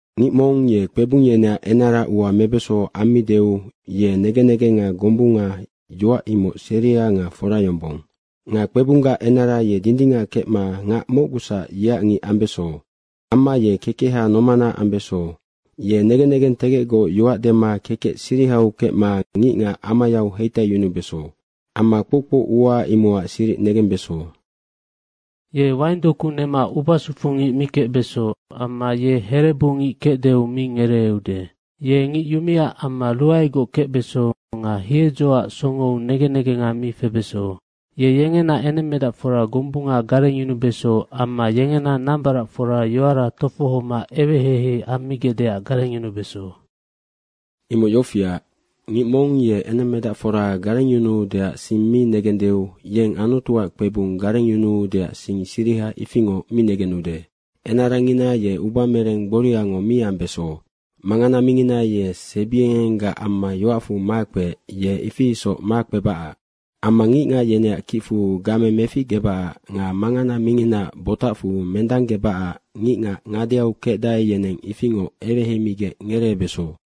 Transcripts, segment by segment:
Ngic mong ye kpebung yeneac enara ua mebeso ammideu ye negen negenga gombunga, yoac imoc seria nga fora yombong. Nga kpebunggac enara ye dindingac kecma ngac mocgusac yeac ngic ambeso. Amma ye kekeha nomana ambeso. Ye negen negentegecgoc yoac dema kekec sirihau kecma ngicngac amayau heitaiyunubeso. Amma kpoukpou ua imocac siric negembeso. Ye waing doku nema ubasufu ngic mi kecbeso amma ye herebungic kecdeu mi ngereeude. Ye ngic yumea amma ruaegoc kecbeso nga hiedzoac songou negen negenga mi febeso. Ye yengena enemmedacfora gombunga garengyunubeso amma yengena nambaracfora yoara tofohoma eweheihei ammigecdeac garengyunubeso. Imoc yofiac, ngic mong ye enemmedacfora garengyunuudeac sing mi negendeu yeng Anutuac kpebung garengyunuudeac sing siriha ifingoc mi negenude. Enarangina ye ubamereng gboriango mi ambeso. Mangana mingina ye sebiengenggac amma yoacfu makpeec ye ifi isoc makpebacac. Amma ngicngac yeneac kicfu game meficgebacac nga mangana minginaac botacfu mendanggebacac ngicngac ngadeau kecdae, yeneng ifingoc eweheimigec ngereebeso.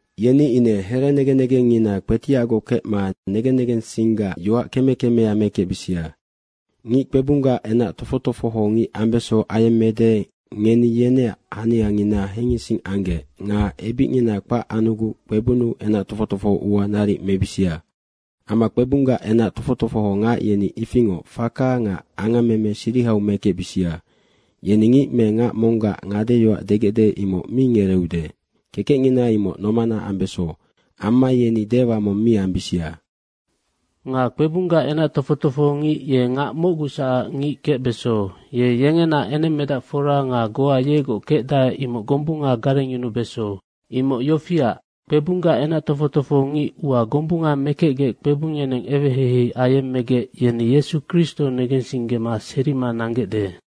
Yeni ine here negen negengngina kpetiacgoc kecma negen negensinggac yoac keme kemea mekecbisia. Ngic kpebunggac enac tofoc tofoho ngic ambeso ayemmede, ngeni yeneac haniangina hengising anggec nga ebicngina kpac anuguc kpebunnu enac tofoc tofoho ua naric mebisia. Amma kpebunggac enac tofoc tofoho ngac yeni ifingoc faka nga angammeme sirihau mekecbisia. Yeni ngic me ngac monggac ngadeyoac degecde, imoc mi ngereeude. Kekecngina imoc nomana ambeso. Amma yeni dewa mong mi ambisia. Nga kpebunggac enac tofoc tofoho ngic ye ngac mocgusacac ngic kecbeso. Ye yengena enemmedacfora nga goa yegoc kecdae, imoc gombunga garengyunubeso. Imoc yofiac, kpebunggac enac tofoc tofoho ngic ua gombunga mekecgec kpebung yeneng eweheihei ayemmegec, yeni Yesu Kristo negensinggema serima nanggecde.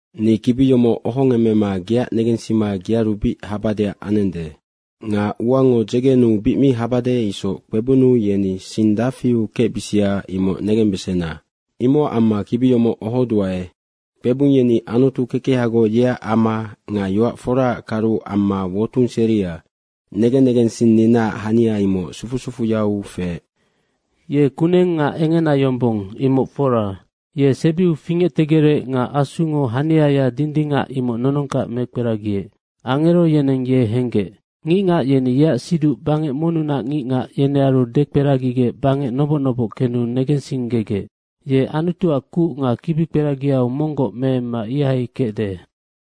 Ni kibi yomoc ohogemma geac negensima gearu bic habadeac anende. Nga uango dzegenuu bic mi habade isoc kpebunnu yeni sing dafiu kecbisia, imoc negembesena, imocac amma kibi yomoc ohoduae. Kpebung yeni Anutu kekehagoc, yeac ama nga yoac foraac karu amma wotung seria. Negen negensinninaac hania imoc sufu sufuyau feec: Ye kuneng nga engena yombong, imoc fora. Ye sebiu fingectegerec nga Asungo haniaya dindingac imoc nonongkac mekperagiec. Angero yeneng ye henggec. Ngicngac yeni yeac siduc bangec monnunac ngicngac, yenearu dekperagigec bangec noboc noboc kenu negensinggegec. Ye Anutuac kuc nga kibikperagiau monggoc meemma ihai kecde.